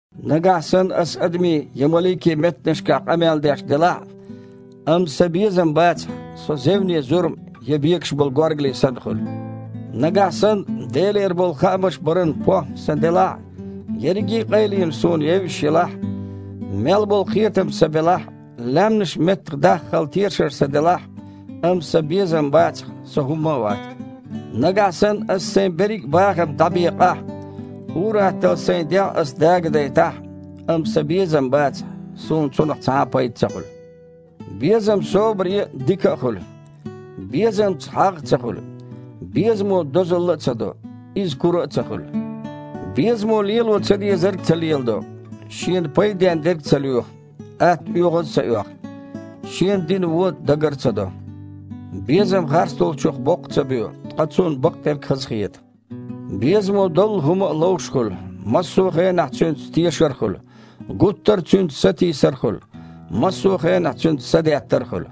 Нагахь санна аса адамийн я маликийн меттанашкахь къамел деш делахь а, амма сан безам бацахь, со зевне зурма я бекаш болу горгали санна хуьлу. Нагахь санна Делера болу хаамаш баран похІма сан делахь а, ерриге а къайленаш суна евзаш елахь а, мел болу кхетам сан белахь а, лаьмнаш а меттахдаххал тешар сан делахь а, амма сан безам бацахь, со хІумма а вац. Нагахь санна аса сайн берриг а бахам дІабекъахь а, ур-атталла сайн дегІ ас дагадайтахь а, амма сан безам бацахь, суна цунах цхьа а пайда ца хуьлу. Безам собаре а, дика а хуьлу. Безамца хьагІ а ца хуьлу. Безамо дозалла а ца до, иза кура а ца хуьлу. Безамо лело ца дезарг ца леладо, шена пайден дерг ца лоьху, атта оьгІаз ца оьху, шена дина вон дагар ца до. Безам харцдолчух боккха ца боь, ткъа цунна бакъдерг хазахета. Безамо доллу хІума а ловш хуьлу, массо а хенахь цуьнца тешар а хуьлу, гуттара а цуьнца сатийсар а хуьлу, массо а хенахь цуьнца садеттар а хуьлу.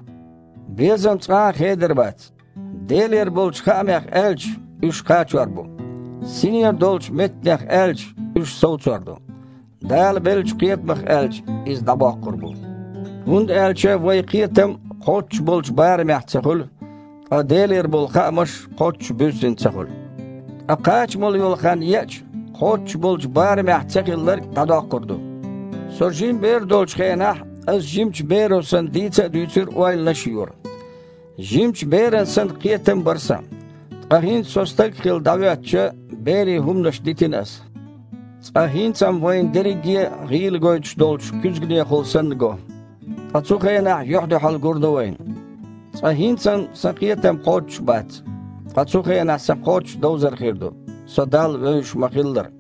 Безам цкъа а хедар бац. Делера болчу хаамех аьлча, уьш кхачор бу. Синера долчу меттанех аьлча, уьш совцор ду. Дала беллачу кхетамах аьлча, иза дІабоккхур бу. ХІунда аьлча вайн кхетам кхоччуш болчу барамехь ца хуьлу, ткъа Делера болу хаамаш кхоччуш буьззина ца хуьлу. Ткъа кхачамалла йолу хан еача, кхоччуш болчу барамехь цахилларг дІадоккхур ду. Со жима бер долчу хенахь, аса жимачу беро санна дийца а дуьйцура, ойланаш а йора. Жимачу беран санна кхетам а бара сан. Ткъа хІинца со стаг а хилла дІахІоьттича, берийн хІуманаш дитина аса. Цкъа хІинца-м вайна дерриге а гІийла гойтуш долчу куьзганехула санна го. Ткъа цу хенахь юьхь-дуьхьал гур ду вайна. Цкъа хІинца-м сан кхетам кхоччуш бац, ткъа цу хенахь сан кхоччуш довзар хир ду, со Далла вевзаш ма-хиллара.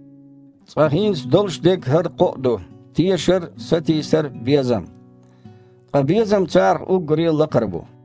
Цкъа хІинца долуш дерг хІара кхоъ ду: тешар, сатийсар, безам. Ткъа безам царах уггаре а лакхара бу.